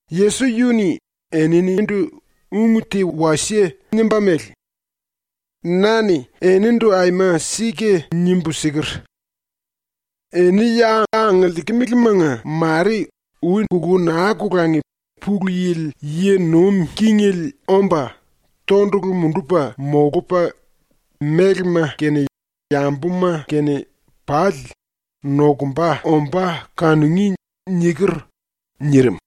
Yesos yu-ni eninindu ung te wasie nimba mele: “Na-ni enindu aima sika nimbu siker: “Eni ya angiliikimilimanga mare ui kulú naa kolangi Pulu Yili yi nuim kingele omba, tondulu mundupa molupa, mélema kene yambuma kene pali nokumba ombá kanungí.” niker.” nirim.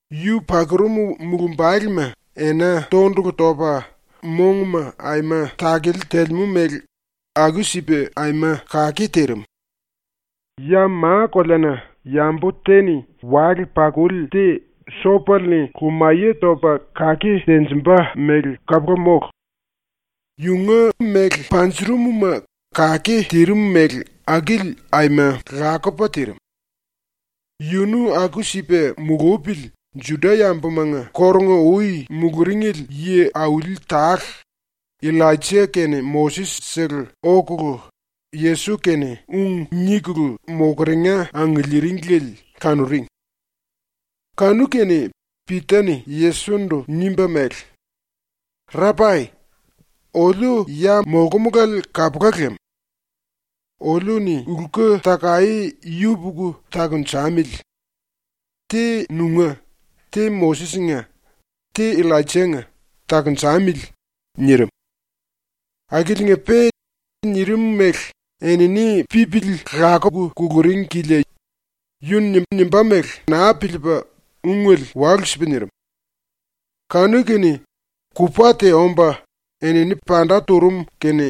yu pakurum mulumbalema ena tondulu topa mongma aima takele telemú mele aku-sipa aima kake tirim. Ya ma-koleana yambu te-ni wale-pakuli te sopele-ni lumaye topa kake tenjimba mele kapula mólu. ⸤Yunga méle panjurum-ma kake tirim mele akili aima lakupa tirim.⸥ Yunu aku-sipa mulupili, ⸤Juda-yambumanga kórunga-ui muluringli yi auli tale,⸥ Illaija kene Moses-sele okulu Yesos-kene ung nikulu mokeringa angiliiringli kanuring. Kanu-kene Pita-ni Yesos-ndu nimba mele: “Rapai, oliu ya molkumulale kapula lam. Oliu-ni lku-takaé yupuku takunjamili. Te nunga, te Moses-nga, te Illaija-nga takunjamili.” nirim. (Akiliinga-pe nirim mele enini pipili lakuku kuluring kilia yu-ni nimbá mele naa piliipa ungele walu-sipa nirim.) Kanu-kene kupa te omba enini panda turum kene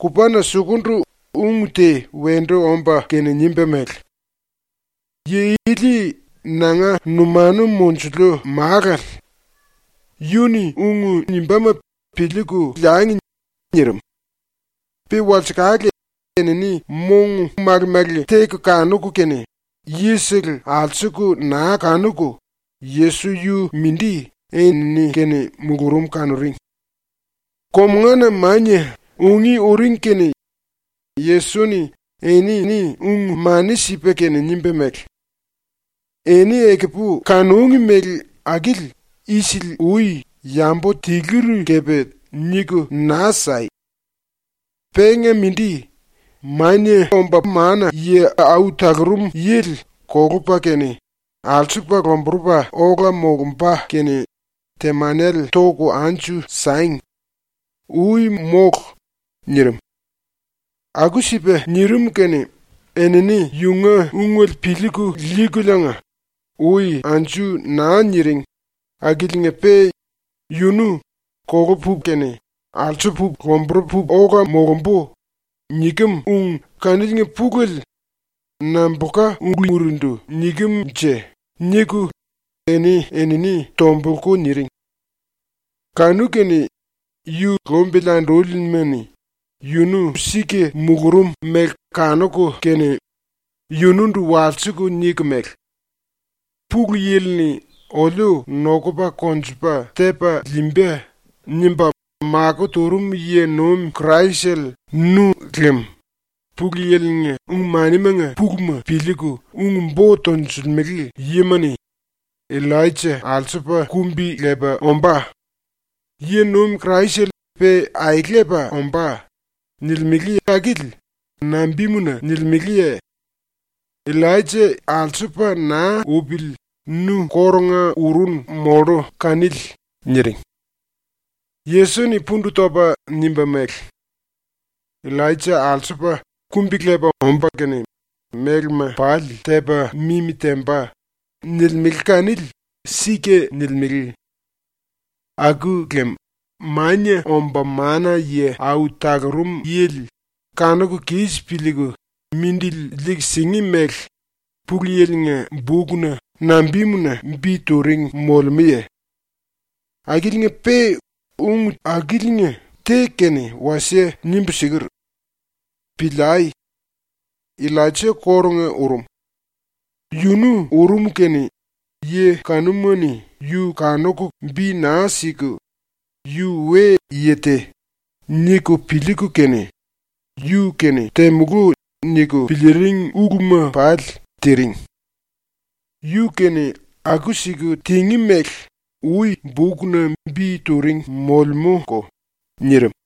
kupana sukundu ung te wendu omba kene nimba mele: “Yi ili nanga numanu monjuliu Málale. Yu-ni ung nimbáma piliiku liangi.” nirim. Pe walsekale, enini mong male-male teku kanuku kene yisele alsuku naa kanuku, Yesos yu-mindi enini-kene mulurum kanuring. Komungana mania ungí uring kene Yesos-ni enini ung-mani sipa kene nimba mele: “Eni ekupu kanúngi mele akili isili-ui yambu tiluri kepe niku naa sai. Penga mindi, Mania Omba Mana-Yi Au Talurum Yili kolupa kene alsupa lomburupa ola molumba kene temanele toku anju sangi. Ui mólu!” nirim. Aku-sipa nirim kene enini yunga ungele piliiku liikuliinga ui anju naa niring akiliinga-pe “yunu “kolupu kene alsupu lomburupu ola molumbu.” nikem ung kaniliinga pulele nambulka ulurindu nikem-nje?” niku eni-enini tombulku niring. Kanu-kene yu lumbili andúlima-ni ⸤yunu sika mulurum mele kanuku kene⸥ yunundu walsiku niku mele: “⸤Pulu Yili-ni ‘oliu nokupa konjupa tepa liimba.’ nimba makó turum yi-nuim Kraisele nu lem⸥ Pulu Yili-nga ung-manimanga puluma piliiku ung-bo tonjilimele yima-ni “Illaija ⸤alsupa⸥ kumbi-lepa ombá. ⸤Yi-nuim Kraisele pe aelepa ombá.⸥” nilimele akili nambimuna nilimeleye? ⸤Illaija alsupa naa upili nu kórunga urunu mollu kanili.⸥” niring. Yesos-ni pundu topa nimba mele: “ “Illaija ⸤alsupa⸥ kumbi-lepa omba kene mélema pali tepa mimi temba.” nilimele kanili sika nilimele. Aku lem Mania Omba Mana-Yi Au Talurum Yili kanuku kis piliiku mindili liiku singí mele ⸤Pulu Yili-nga⸥ bukna nambimuna bi turing molemúye? Akiliinga-pe ⸤ung akiliinga te kene wasie nimbu siker.⸥ Piliai! Illaija kórunga urum. Yunu urum kene ⸤yi kanuma-ni yu kanuku bi naa siku⸥ ‘yu we-yi te.’ niku piliiku kene ‘yu-kene temulú.’ niku piliiring uluma pali tiring. Yu-kene aku-siku tingí mele ui bukna bi turing molemúko.” nirim.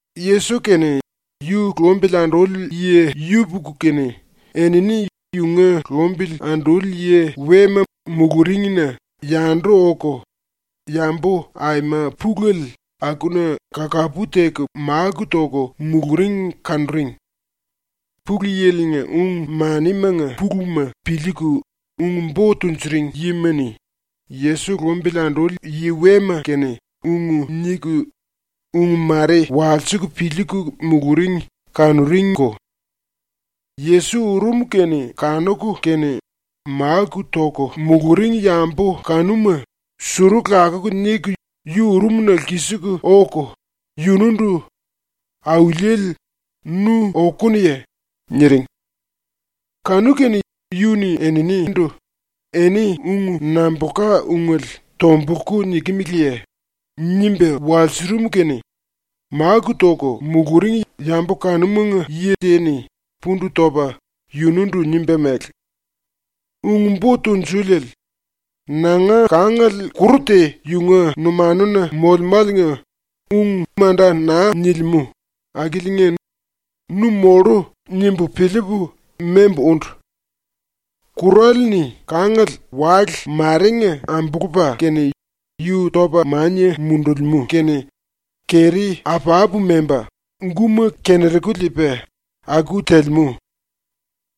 ⸤Yesos kene yu lumbili anduli yi yupuku kene⸥ enini yunga lumbili anduli yi wema muluringna yandu oku, yambu aima pulele akuna kakapu teku máku toku muluring kanuring. Pulu Yili-nga ung-manimanga puluma piliiku ung-bo tunjuring yima-ni Yesos lumbili anduli yi wema kene ung niku, ung mare walsiku piliiku muluring kanuringko. Yesos urum kene kanuku kene máku toku muluring yambu kanuma suru lakuku niku yu urumna lkisiku oku yunundu “⸤Auliele,⸥ nu okunuye?” niring. Kanu-kene yu-ni eninindu “Eni ung nambulka ungele tombulku nikimiliye?” nimba walsurum kene máku toku muluring yambu kanumanga yi te-ni pundu topa yunundu nimba mele: “Ung-Bo Tunjuliele, nanga kangale kuru te yunga numanuna molemáliinga ung manda naa nilimú akiliinga nu mullu ⸤nimbu piliipu⸥ membu úndu. Kurale-ni kangale wale marenga ambulupa kene yu topa mania mundulimú kene keri apapu memba, guma kenu-keru liipa aku telemú.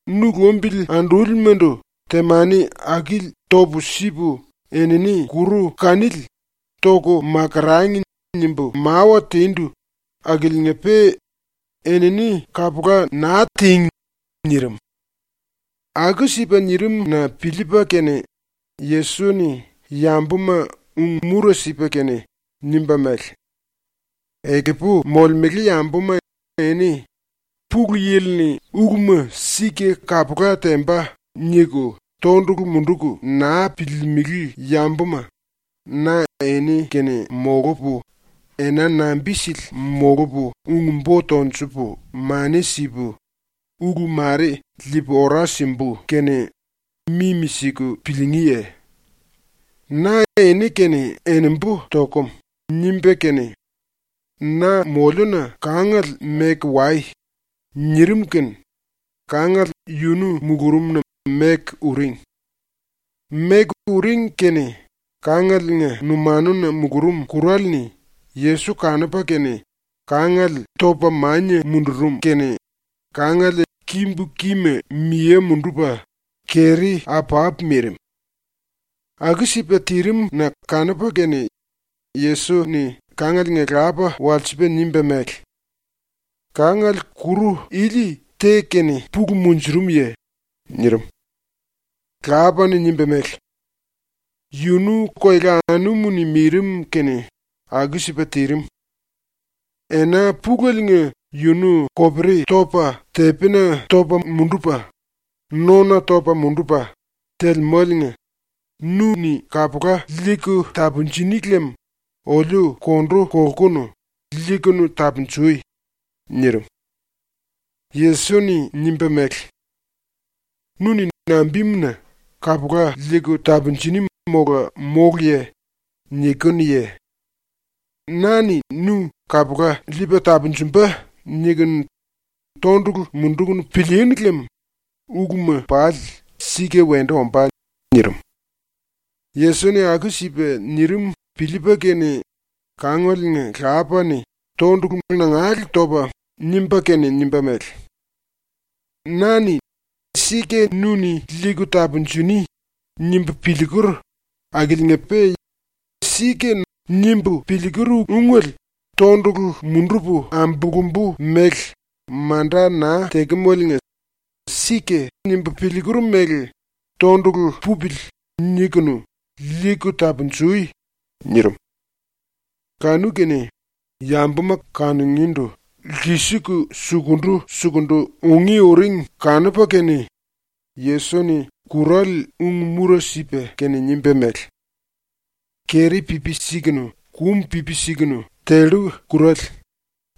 Nu lumbili andúlimandu temani akili topu sipu enini kuru kanili ‘Toku makurangi.’ nimbu mawa tindu akiliinga-pe enini kapula naa tíngi.” nirim. Aku-sipa nirim-na piliipa kene Yesos-ni yambuma ⸤ung-mura sipa kene⸥ nimba mele: “Ekupu molemele yambuma eni ⸤‘Pulu Yili-ni uluma sika kapula temba.’ niku⸥ tondulu munduku naa piliilimili yambuma, na eni-kene molupu, ena nambi-sili molupu ung-bo tonjupu mani sipu ulu mare liipu ora simbu kene mimi-siku piliingíye? ⸤Na eni-kene enembu tokum.⸥” nimba kene “Na moliuna kangale meku wai.” nirim kene kangale yunu mulurumna meku uring. Meku uring kene ⸤kangalenga numanuna mulurum⸥ kurale-ni Yesos kanupa kene kangale topa mania mundurum kene kangale kimbu kima miye mundupa keri apapu mirim. Aku-sipa tirim-na kanupa kene Yesos-ni kangalenga lapa walsipa nimba mele: “Kangale kuru ili te-kene pulu monjurumuye?” nirim. Lapa-ni nimba mele: “Yunu koela anumu-ni mirim kene aku-sipa tirim. Ena puleliinga yunu kopari topa tepina topa mundupa, nona topa mundupa telemáliinga nu-ni kapula liiku tapunjuni lem oliu kondu kolkunu liiku tapunjui.” nirim. Yesos-ni nimba mele: “Nu-ni nambimuna “Kapula liiku tapunjuni mola móluye?” nikinuye? ‘Na-ni nu kapula liipa tapunjumba.’ niku tondulu munduku pilíínu lem uluma pali sika wendu ombá.” nirim. Yesos-ni aku-sipa nirim piliipa kene kangalenga lapa-ni tondulu nangale topa nimba kene nimba mele: “Na-ni ‘sika nu-ni liiku tapunjuni.’ nimbu piliiker akiliinga-pe ‘Sika’ nimbu piliiker ungele tondulu mundupu ambulumbu mele manda naa tekemaliinga ‘Sika.’ nimbu piliiker mele ‘tondulu pupili.’ nikunu liiku tapunjui.” nirim. ⸤Kanu-kene⸥ yambuma kanungíndu lkisiku sukundu-sukundu ungí uring kanupa kene Yesos-ni kurale ung-mura sipa kene nimba mele: “Keri pipi sikunu, kum pipi sikunu tellu kurale,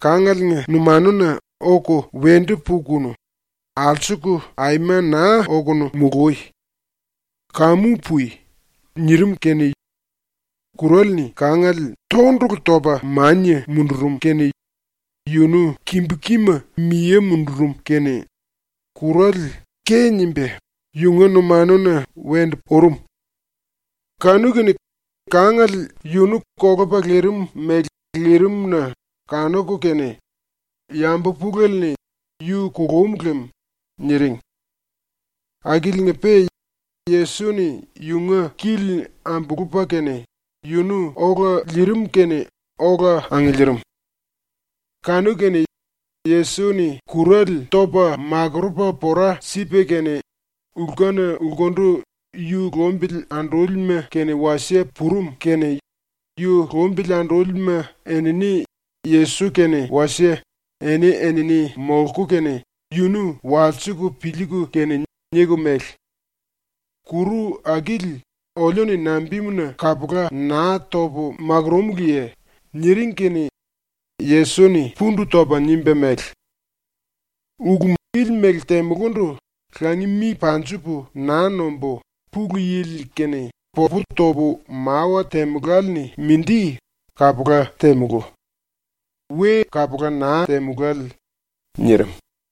kangalenga numanuna oku wendu pukunu, alsuku aima naa okunu mului. Kamu pui!” nirim kene kurale-ni kangale tondulu topa mania mundurum kene yunu kimbu kima miye mundurum kene kurale ke nimba yunga numanuna wendu urum. Kanu-kene kangale yunu kolupa lirim mele lirim-na kanuku kene yambu pulele-ni “Yu kulum lem.” niring. Akiliinga-pe Yesos-ni yunga kili ambulupa kene yunu ola liirim kene ola angiliirim. ⸤Kanu-kene Yesos-ni kurale topa makurupa pora sipa kene⸥ lkuna lkundu ⸤yu lumbili andúlima kene wasie⸥ purum kene yu lumbili andúlima enini Yesos kene wasie eni-enini molku kene yunu walsiku piliiku kene niku mele: “Kuru akili oliu-ni nambimuna kapula naa topu makurúmuluye?” niring kene Yesos-ni pundu topa nimba mele: “Ulu ili mele temulundu (langi mi panjupu naa nombu) Pulu Yili-kene popu topu mawa temuláli-ni mindi kapula temulú. We kapula naa temulále.” nirim.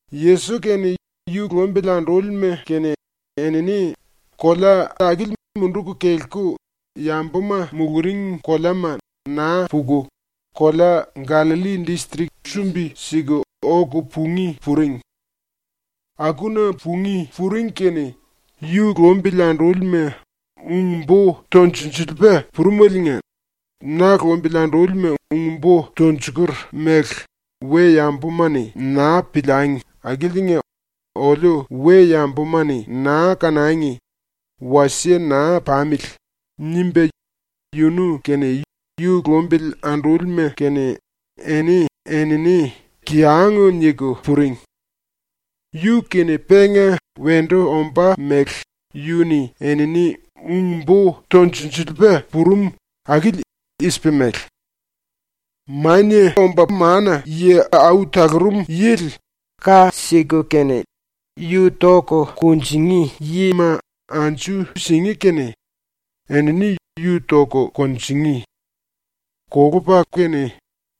⸤Yesos kene yu lumbili andúlima kene⸥ enini kolea akili munduku kelku ⸤yambuma muluring koleama naa puku⸥ kolea Gallalli distrik sumbi-siku oku pungí puring. Akuna pungí puring kene yu lumbili andúlima ung-bo tunjilsiliipa purumeliinga ‘Na lumbili andúlima ung-bo tunjiker mele we-yambuma-ni naa piliangi akiliinga oliu we-yambuma-ni naa kanangi, wasie naa pamili.’ nimba yunu kene yu lumbili andúlima kene eni-enini kiyang niku puring. ⸤Yu-kene penga wendu ombá mele⸥ yu-ni enini ung-bo tunjilsiliipa purum akili i-sipa mele: “Mania Omba Mana-Yi Au Talurum Yili ka siku kene ⸤yu toku kunjingí⸥ yima anju singí kene enini yu toku kunjingí. Kolupa kene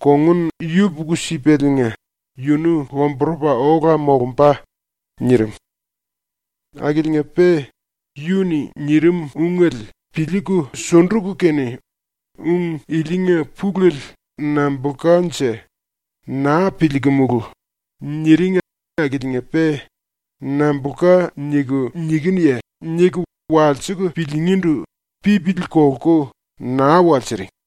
kongun yupuku-sipaliinga yunu lomburupa ola molumba.” nirim. Akiliinga-pe yu-ni nirim ungele piliiku sunduku kene ‘Ung ilinga pulele nambulkanje, naa piliikumulu.’ niring akiliinga-pe “Nambulka niku nikinuye?” niku walsiku piliingíndu pipili kolku naa walsiring.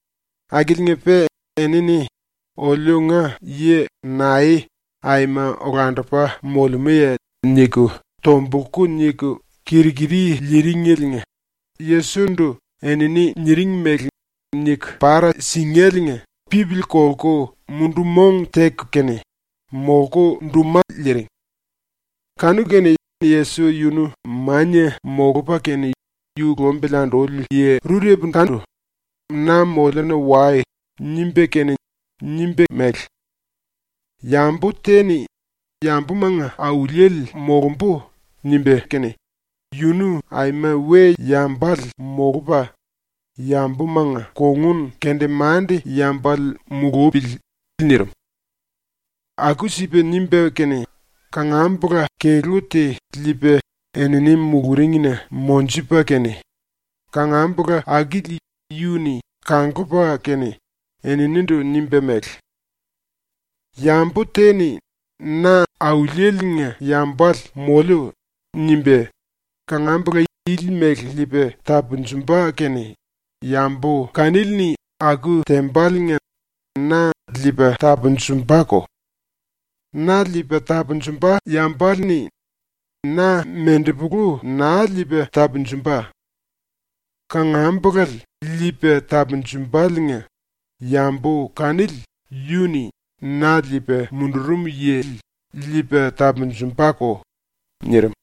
Akiliinga-pe enini ‘Oliunga yi nae aima olandupa molemúye?’ niku tombulku niku kir-kiri liiringeliinga Yesos-ndu enini niring mele niku para singéliinga ⸤pipili kolku mundu-mong teku kene⸥ molku duma liiring. Kanu-kene Yesos yunu mania molupa kene yu lumbili anduli yi rurepukandu “Na moliuna wai.” nimba kene nimba mele: “Yambu te-ni ‘Yambumanga auliele molumbu.’ nimba kene yunu aima we-yambale molupa yambumanga kongun-kendemande-yambale mulupili.” nirim. Aku-sipa nimba kene kangambula kelú te liipa enini muluringna monjupa kene, kangambula akili yu-ni kanglupa kene eninindu nimba mele: “Yambu te-ni ‘Na Auliele-nga yambale moliu.’ nimba kangambula ili mele liipa tapunjumba kene yambu kanili-ni aku tembaliinga na liipa tapunjumbako. Na liipa tapunjumba yambale-ni na mendepulu naa liipa tapunjumba. Kangambulale liipa tapunjumbaliinga yambu kanili yu-ni na liipa mundurum yili liipa tapunjumbako.” nirim.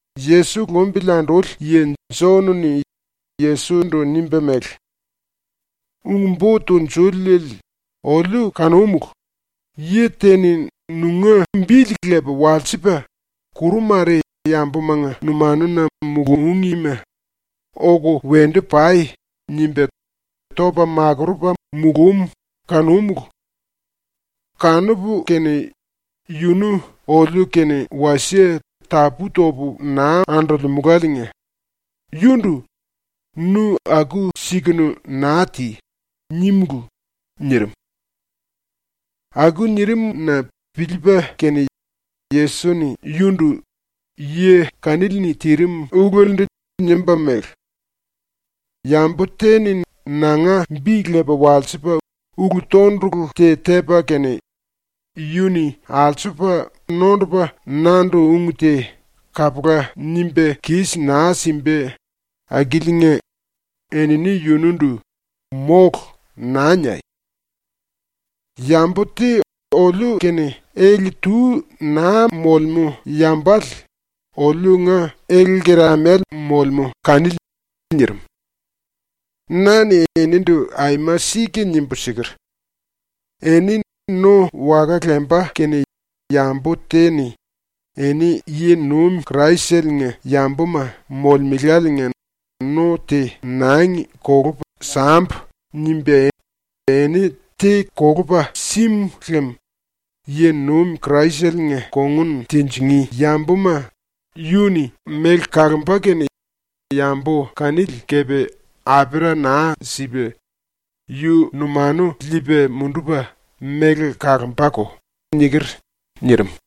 ⸤Yesos lumbili anduli yi⸥ Jon-ni Yesos-ndu nimba mele: “Ung-Bo Tunjuliele, oliu kanúmulu, yi te-ni nunga bili lepa walsipa kuru mare yambumanga numanuna mulúngima “Oku wendu pai!” nimba topa makurupa mulúm kanúmulu. Kanupu kene yunu oliu-kene wasie tapú-topu naa andolemuláliinga yundu “Nu aku-sikunu naa ti!” nímulu.” nirim. Aku nirim-na piliipa kene Yesos-ni yundu ⸤yi kanili-ni tirim ulelendu⸥ nimba mele: “Yambu te-ni nanga bi lepa walsipa ulu-tondulu te tepa kene yu-ni alsupa nondupa nandu ung te kapula nimba kis naa simba akiliinga enini yunundu “Mólu!” naa niai. Yambu te oliu-kene ele-tu naa molemú yambale oliunga ele-lkeramale molemú kanili.” ⸤nirim.⸥ “Na-ni enindu aima sika nimbu siker: “Eni no waka lemba kene yambu te-ni ‘Eni yi-nuim Kraisele-nga yambuma molemeláliinga no te nangi kolupu sambu.’ nimba eni te kolupa símu lem, yi-nuim Kraisele-nga kongun tinjingí yambuma yu-ni méle kalomba kene yambu kanili kepe apera naa sipa, yu numanu liipa mundupa méle kalombako.” niker.” nirim.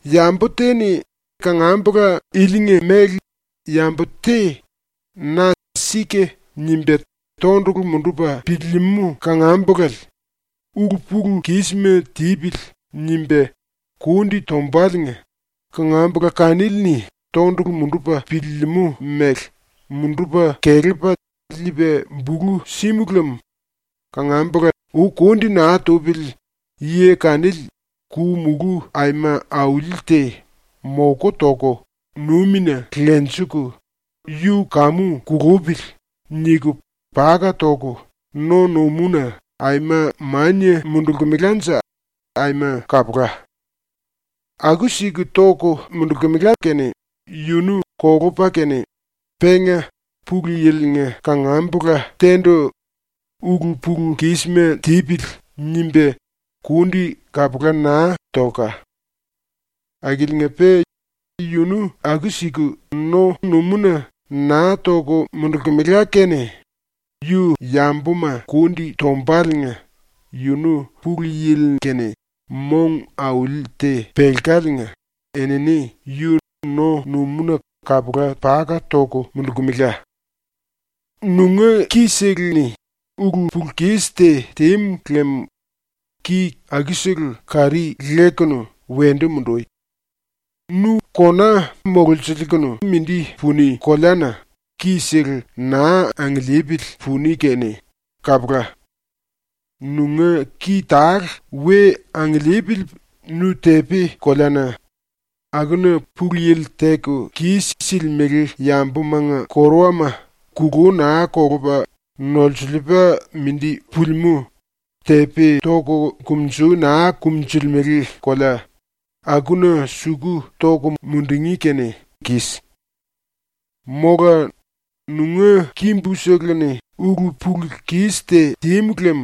“Yambu te-ni kangambula ilinga ⸤mele yambu⸥ te na ‘Sika’ nimba tondulu mundupa piliilimú kangambulale ‘Ulu-pulu-kisma tipili.’ nimba kundi tombaliinga kangambula kanili-ni tondulu mundupa piliilimú mele mundupa kelepa liipa bulu símu lem ⸤kangambula ui kundi naa tupili⸥ yi kanili ku-mulú aima auli te moku toku numina lenjiku ‘Yu kamu kulupili.’ niku paka toku no-numúna aima mania mundulkemelanje aima kapula. ⸤Aku-siku toku mundulkemela kene yunu kolupa kene penga Pulu Yili-nga kangambula te-ndu ‘Ulu-pulu-kisma tipili.’ nimba kundi kapula naa tolka. Akiliinga-pe yunu aku-siku no-numúna naa toku mundulkemela kene yu yambuma kundi tombaliinga yunu Pulu Yili-kene mong auli te pelkaliinga enini yu no-numúna kapula paka toku mundulkemela.⸥ “Nunga ki-sele-ni ulu-pulu-kis te tímu lem ki akusele kari lekunu wendu mundui. Nu kona mololsiliikunu mindi puni koleana ki-sele naa angiliipili puni kene kapula. Nunga ki tale we angiliipili nu tepi-koleana, (‘akuna Pulu Yili teku kis-silimele yambumanga koruwama kulú naa kolupa nolsiliipa mindi pulimú, tepi toku kumunjui naa kumunjulimele kolea’) akuna suku toku mundungí kene kis. “Mola nunga kimbu-seleni ulu-pulu-kis te tímu lem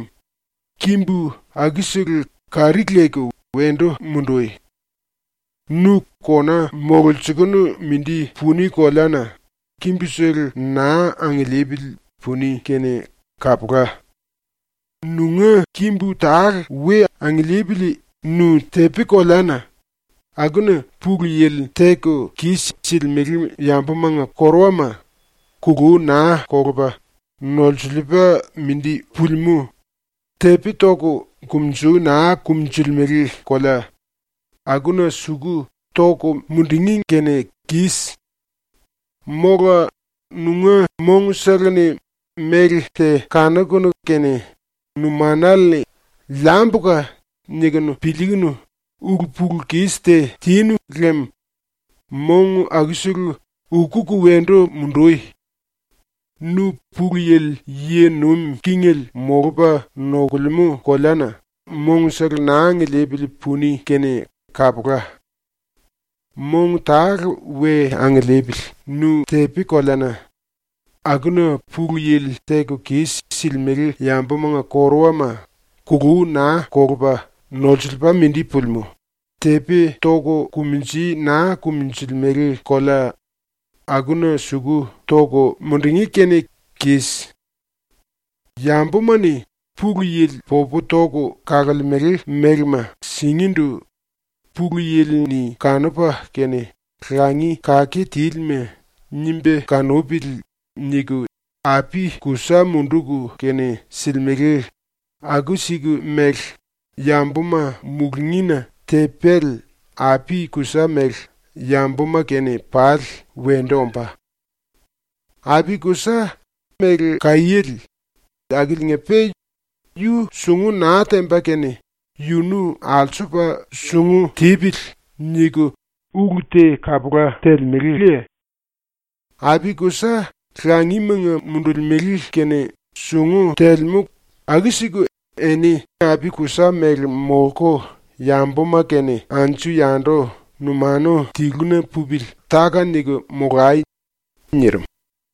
kimbu akusele kari leku wendu mundui. Nu kona mololsiliikunu mindi puni koleana kimbusele naa angiliipili puni kene kapula. Nunga kimbu tale we angiliipili nu tepi-koleana, (‘akuna Pulu Yili teku kis-silimele yambumanga koruwama kulú naa kolupa nolsiliipa mindi pulimú, tepi toku kumunjui naa kumunjulimele kolea’) akuna suku toku mundungí kene kis. “Mola nunga mongsele-ni méle te kanukunu kene numanale-ni ‘liambuka.’ nikunu piliikunu ulu-pulu-kis te tinu lem mong akusele ukuku wendu mundui. Nu Pulu Yili yi nuim kingele molupa nokulemú koleana mongsele naa angiliipili puni kene kapula. Mong tale we angiliipili nu tepi-koleana, ‘akuna Pulu Yili teku kis-silimele yambumanga koruwama kulú naa kolupa nolsiliipa mindi pulimú, tepi toku kumunjui naa kumunjulimele kolea’ akuna suku toku mundungí kene kis. “Yambuma-ni Pulu Yili popu toku kalemele mélema singíndu ‘Pulu Yili-ni kanupa kene ‘Langi kake tílima.’ nimba kanupili.’ niku api-kusa munduku kene silimele aku-siku mele yambuma mulungína tepéle, api-kusa mele, yambuma kene pali wendu ombá. Api-kusa méle kaiéle akiliinga-pe yu sungu naa temba kene ‘Yunu alsupa sungu tipili.’ niku ulu te kapula telemeleye? ⸤Api-kusa langimanga mundulimele kene sungu telemú aku-siku⸥ eni api-kusa mele molku yambuma kene anju-yandu numanu tiluna pupili táka-niku molai.” nirim.